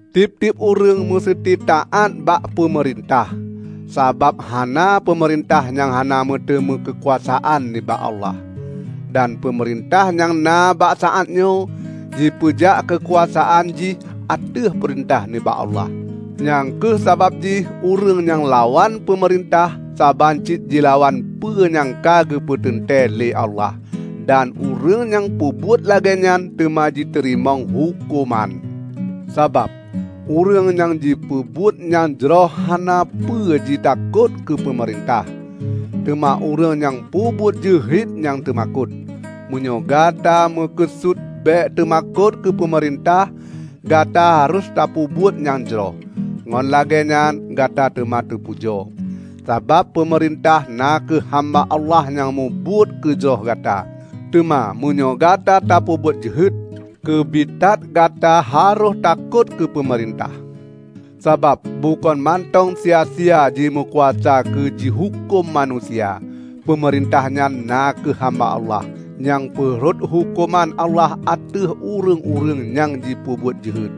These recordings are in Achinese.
Tieb-tieb ureuëng museuti taát bak peumeurintah, sabab hana peumeurintah nyang hana meuteumé keukuasaan nibak Allah. Dan peumeurintah nyang na bak saát nyoe, jipeujak keukuasaan jih ateueh peurintah nibak Allah. Nyang kheueh sabab jih ureuëng nyang lawan peumeurintah saban cit jilawan peue nyang ka geupeunteuntée lé Allah. Dan ureuëng nyang peubuet lagée nyan teuma jiteurimong huköman. Sabab, ureuëng nyang jipeubuet nyang jroh hana peue jitakot keu peumeurintah. Teuma ureuëng nyang peubuet jeuhet nyang teumakot. Meunyoe Gata meukeusut bék teumakot keu peumeurintah, Gata harôh tapeubuet nyang jroh, ngon lagée nyan Gata teuma teupujoe. Sabab peumeurintah na kheueh hamba Allah nyang mubuet keu jroh gata. Teuma meunyoe Gata tapeubuet jeuhet, keubiet that Gata harôh takot keu peumeurintah, sabab bukon mantong sia-sia jimeukuasa keu jihuköm manusia. Peumeurintah nyan na kheueh hamba Allah, nyang peurhot huköman Allah ateueh ureuëng-ureuëng nyang jipeubuet jeuhet.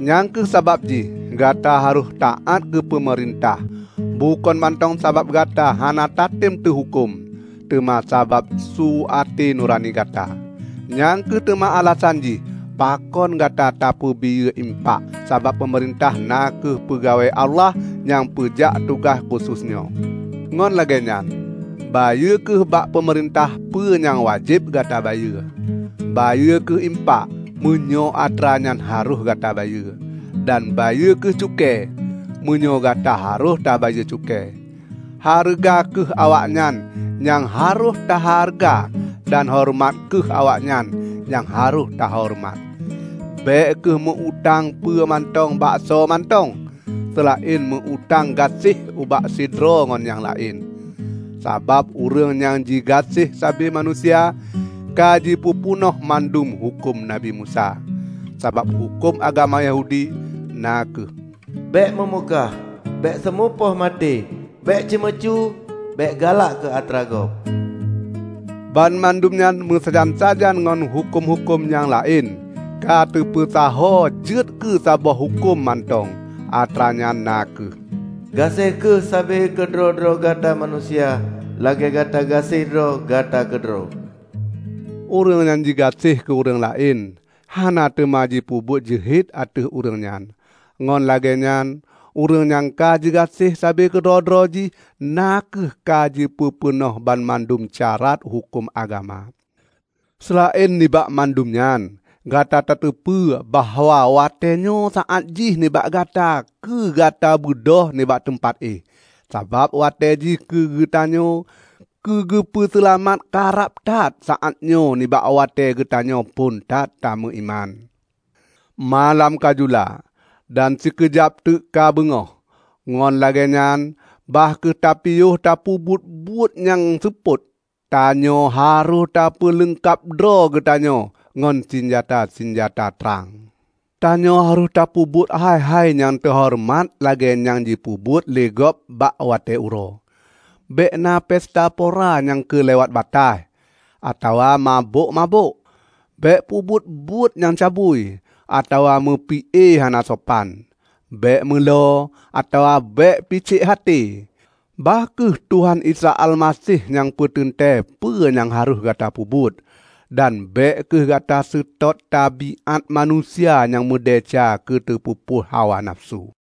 Nyang kheueh sabab jih Gata harôh taát keu peumeurintah -- bukon mantong sabab Gata hana tatem teuhuköm, teuma sabab su até nurani gata. Nyang kheueh teuma alasan jih pakon Gata tabayeue impak, sabab peumeurintah na kheueh peugawée Allah nyang peujak tugaih khusos nyoe. Ngon lagée nyan, bayeue kheueh bak peumeurintah peue nyang wajéb Gata bayeue. Bayeue kheueh impak, meunyoe atra nyan harôh Gata bayeue, dan bayeue kheueh cukée, meunyoe gata harôh tabayeue cukée. Hareuga kheueh awaknyan nyang harôh tahareuga dan horeumat kheueh awaknyan nyang harôh tahoreumat. Bék kheueh meu-utang peue mantong bak soe mantong, seulaén meu-utang gaséh ubak sidroe ngon nyang laén. Sabab ureuëng nyang jigaséh sabe manusia, ka jipeupeunoh mandum huköm Nabi Musa. Sabab huköm agama Yahudi, na kheueh: Bék meumukah, bék seumupoh maté, bék ceumeucue, bék galak keu atra gob; banmandum nyan meusajan-sajan ngon huköm-huköm nyang laén, ka teupeusaho jeuet keu saboh huköm mantong, atranyan na kheueh, "Gaséh kheueh sabe keudroe-droe gata manusia lagée gata gaséh droe gata keudroe." Ureuëng nyang jigaséh keu ureuëng laén, hana teuma jipeubuet jeuhet ateueh ureuëng nyan. Ngon lagée nyan ureuëng nyang ka jigaséh sabe keudroe-droe jih na kheueh ka jipeupeunoh banmandum syarat huköm agama. Seulaén nibak mandum nyan gata tateupeue bahwa watée nyoe saát jih nibak gata keu gata beudôh nibak teumpat éh. Sabab, watée jih keu geutanyoe keu geupeu seulamat ka rab that saát nyoe nibak watée geutanyoe phon that tameuiman. Malam ka jula; dan sikeujab teuk ka beungoh. Ngon lagée nyan, bah kheueh tapiôh tapeubuet buet-buet nyang seupôt. Tanyoe harôh tapeuleungkab droe geutanyoe ngon sinjata-sinjata trang. Tanyoe harôh tapeubuet hai-hai nyang teuhoreumat lagée nyang jipeubuet lé gob bak watée uroe; bék na pesta pora nyang keulewat bataih, atawa mabök-mabök. Bék peubuet buet nyang cabui, atawa meupi-e hana sopan. Bék meulo, atawa bék picék até. Bah kheueh Tuhan Isa Almaseh nyang peuteuntée peue nyang harôh gata peubuet. Dan bék kheueh gata seutôt tabiát manusia nyang meudesya keu teupeupuih hawa nafeusu.